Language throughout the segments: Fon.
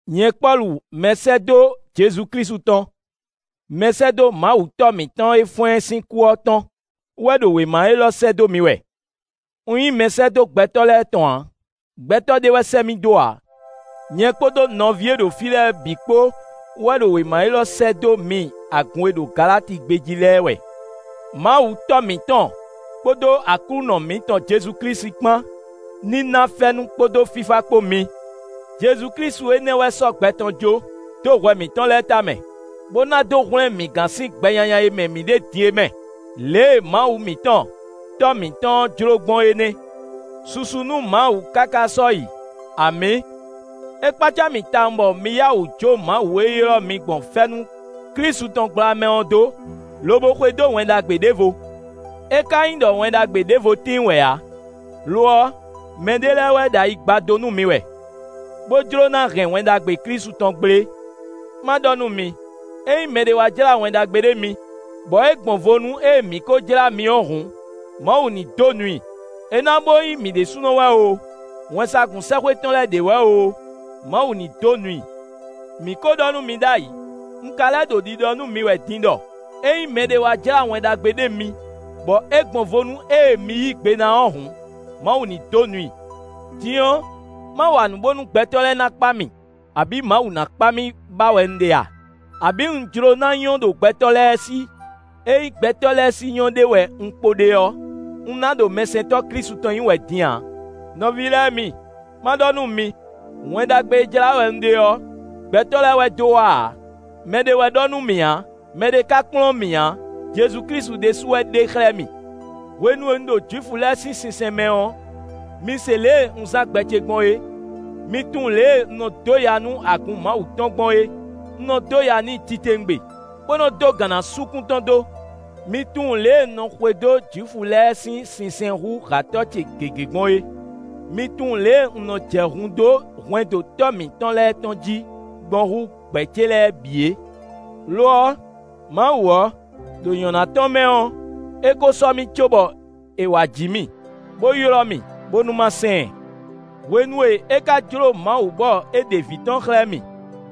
Nyɛ Pɔ́lu, mɛsɛ́dó Jezu Klísu tɔn, mɛsɛ́dó Mawu Tɔ́ mǐtɔn e fɔ́n ɛ sín kú ɔ́ tɔn wɛ ɖo wěma élɔ́ sɛ́ dó mi wɛ. Un nyí mɛsɛ́dó gbɛtɔ́ lɛ́ɛ tɔn ǎ; gbɛtɔ́ ɖé wɛ sɛ́ mì dó ǎ. Nyɛ kpódó nɔví e ɖo fí lɛ́ɛ bǐ kpó wɛ ɖo wěma élɔ́ sɛ́ dó mi agun e ɖo Galati gbé jí lɛ́ɛ wɛ. Mawu Tɔ́ mǐtɔn kpódó Aklúnɔ mǐtɔn Jezu Klísu kpán ní ná fɛ́nú kpódó fífá kpó mi. JezuKlísu énɛ́ wɛ sɔ́ gbɛ tɔn jó, dó hwɛ mǐtɔn lɛ́ɛ tamɛ, bó ná dó hwlɛ́n mǐ gán sín gbɛ nyanya e mɛ mǐ ɖe din é mɛ. Lě e Mawu mǐtɔn, Tɔ́ mǐtɔn ɔ́ jló gbɔn é nɛ́. Susu nú Mawu káká sɔ́yi! Amǐ. É kpácá mì tawun bɔ mi yá wǔ jó Mawu e ylɔ́ mi gbɔn fɛ́nú Klísu tɔn gbla mɛ ɔ́ dó, lobo xwedó Wɛn Ɖagbe ɖěvo. É ka nyí ɖɔ Wɛn Ɖagbe ɖěvo tíin wɛ ǎ; lo ɔ́, mɛɖé lɛ́ɛ wɛ ɖo ayi gbadó nú mi wɛ, bó jló ná hɛn Wɛn Ɖagbe Klísu tɔn gblé. Má ɖɔ nú mi: ényí mɛɖé wá jlá Wɛn Ɖagbe ɖé mi, bɔ é gbɔn vo nú ée mǐ kó jlá mi ɔ́ hǔn, Mawu ní dó nu i. É ná bó nyí mǐ ɖésúnɔ wɛ oo, wɛnsagun sɛ́xwé tɔn lɛ́ɛ ɖě wɛ oo, Mawu ní dó nu i. Mǐ ko ɖɔ nú mi ɖ'ayǐ; un ka lɛ́ ɖo ɖiɖɔ nú mi wɛ din ɖɔ ényí mɛɖé wá jlá Wɛn Ɖagbe ɖé mi bɔ é gbɔn vo nú ée mi yí gbe ná ɔ́ hǔn, Mawu ní dó nu i. Din ɔ́, má wa nǔ bónú gbɛtɔ́ lɛ́ɛ ná kpa mì, abǐ Mawu ná kpa mì ba wɛ un ɖe a? Abǐ un jló ná nyɔ́ ɖo gbɛtɔ́ lɛ́ɛ sí? Ényí gbɛtɔ́ lɛ́ɛ sí nyɔ́ ɖe wɛ un kpo ɖe ɔ́, un ná ɖo mɛsɛntɔ́ Klísu tɔn nyí wɛ din ǎ. Nɔví lɛ́ɛ mi! Má ɖɔ nú mi: Wɛn Ɖagbe e jlá wɛ un ɖe ɔ́, gbɛtɔ́ lɛ́ɛ wɛ dó wá ǎ; mɛɖé wɛ ɖɔ nú mì ǎ; mɛɖé ka kplɔ́n mì ǎ; Jezu Klísu ɖésú wɛ ɖe xlɛ́ mì. Hwenu e un ɖo Jwifu lɛ́ɛ sín sinsɛn mɛ ɔ́, mi se lě e un zán gbɛ ce gbɔn é; mi tunwun lě e un nɔ dó ya nú agun Mawu tɔn gbɔn é; un nɔ dó ya n'i titewungbe, bó nɔ dó gǎn ná sú kún tɔn dó. Mi tunwun lě e un nɔ xwedó Jwifu lɛ́ɛ sín sinsɛn hú hǎtɔ́ ce gěgé gbɔn é; mi tunwun lě e un nɔ jɛ hun dó hwɛndo tɔ́ mǐtɔn lɛ́ɛ tɔn jí gbɔn hú gbɛ̌ ce lɛ́ɛ bǐ é. Lo ɔ́, Mawu ɔ́, ɖo nyɔ̌ná tɔn mɛ ɔ́, é ko sɔ́ mì cóbɔ è wá ji mì, bó ylɔ́ mì, bónú má sɛn ɛ. Hwenu e é ka jló Mawu bɔ é ɖe vǐ tɔn xlɛ́ mì,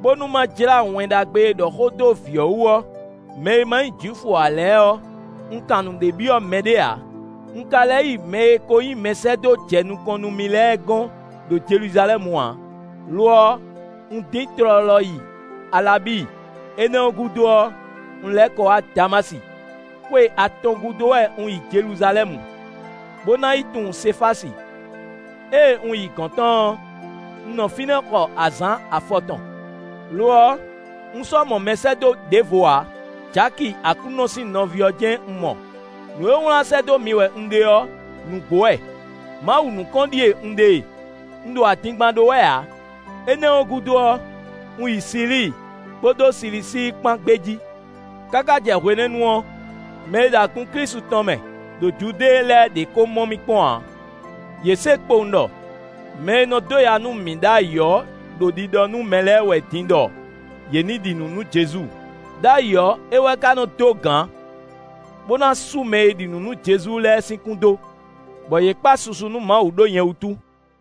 bónú má jlá Wɛn Ɖagbe e ɖɔ xó dó vǐ ɔ́ wú ɔ́ mɛ e ma nyí Jwifu ǎ lɛ́ɛ ɔ́, un kan nǔɖé byɔ́ mɛɖé ǎ; un ka lɛ́ yi mɛ e ko nyí mɛsɛ́dó jɛ nukɔn nú mì lɛ́ɛ gɔ́n ɖo Jeluzalɛ́mu ǎ; lo ɔ́, un dín tlɔlɔ yi Alabíi; énɛ́ ɔ́ gúdo ɔ́, un lɛ́ kɔ wá Damási. Xwe atɔn gúdo wɛ un yi Jeluzalɛ́mu, bó ná yi tunwun Sefási; ée un yi gɔ̌n tɔn ɔ́, un nɔ fínɛ́ xɔ azǎn afɔtɔn. Lo ɔ́, un sɔ́ mɔ mɛsɛ́dó ɖěvo ǎ; Jaki Aklúnɔ sín nɔví ɔ́ jɛ́n un mɔ. Nǔ e wlán sɛ́ dó mi wɛ un ɖe ɔ́ nǔgbó wɛ. Mawu nukɔn ɖíe un ɖe e; un ɖo adingban ɖó wɛ ǎ. Énɛ́ ɔ́ gúdo ɔ́, un yi Silíi, kpódó Silisíi kpán gbé jí. Káká jɛ hwenɛ́nu ɔ́, mɛ e ɖo agun Klísu tɔn mɛ ɖo Judée lɛ́ɛ ɖě kó mɔ mì kpɔ́n ǎ. Yě se kpowun ɖɔ: “Mɛ e nɔ dó ya nú mǐ ɖ'ayǐ ɔ́ ɖo ɖiɖɔ nú mɛ lɛ́ɛ wɛ din ɖɔ yě ní ɖi nǔ nú Jezu. Đ'ayǐ ɔ́, é wɛ ka nɔ dó gǎn, bó ná sú mɛ e ɖi nǔ nú Jezu lɛ́ɛ sín kún dó.” Bɔ yě kpa susu nú Mawu ɖó nyɛ wútu.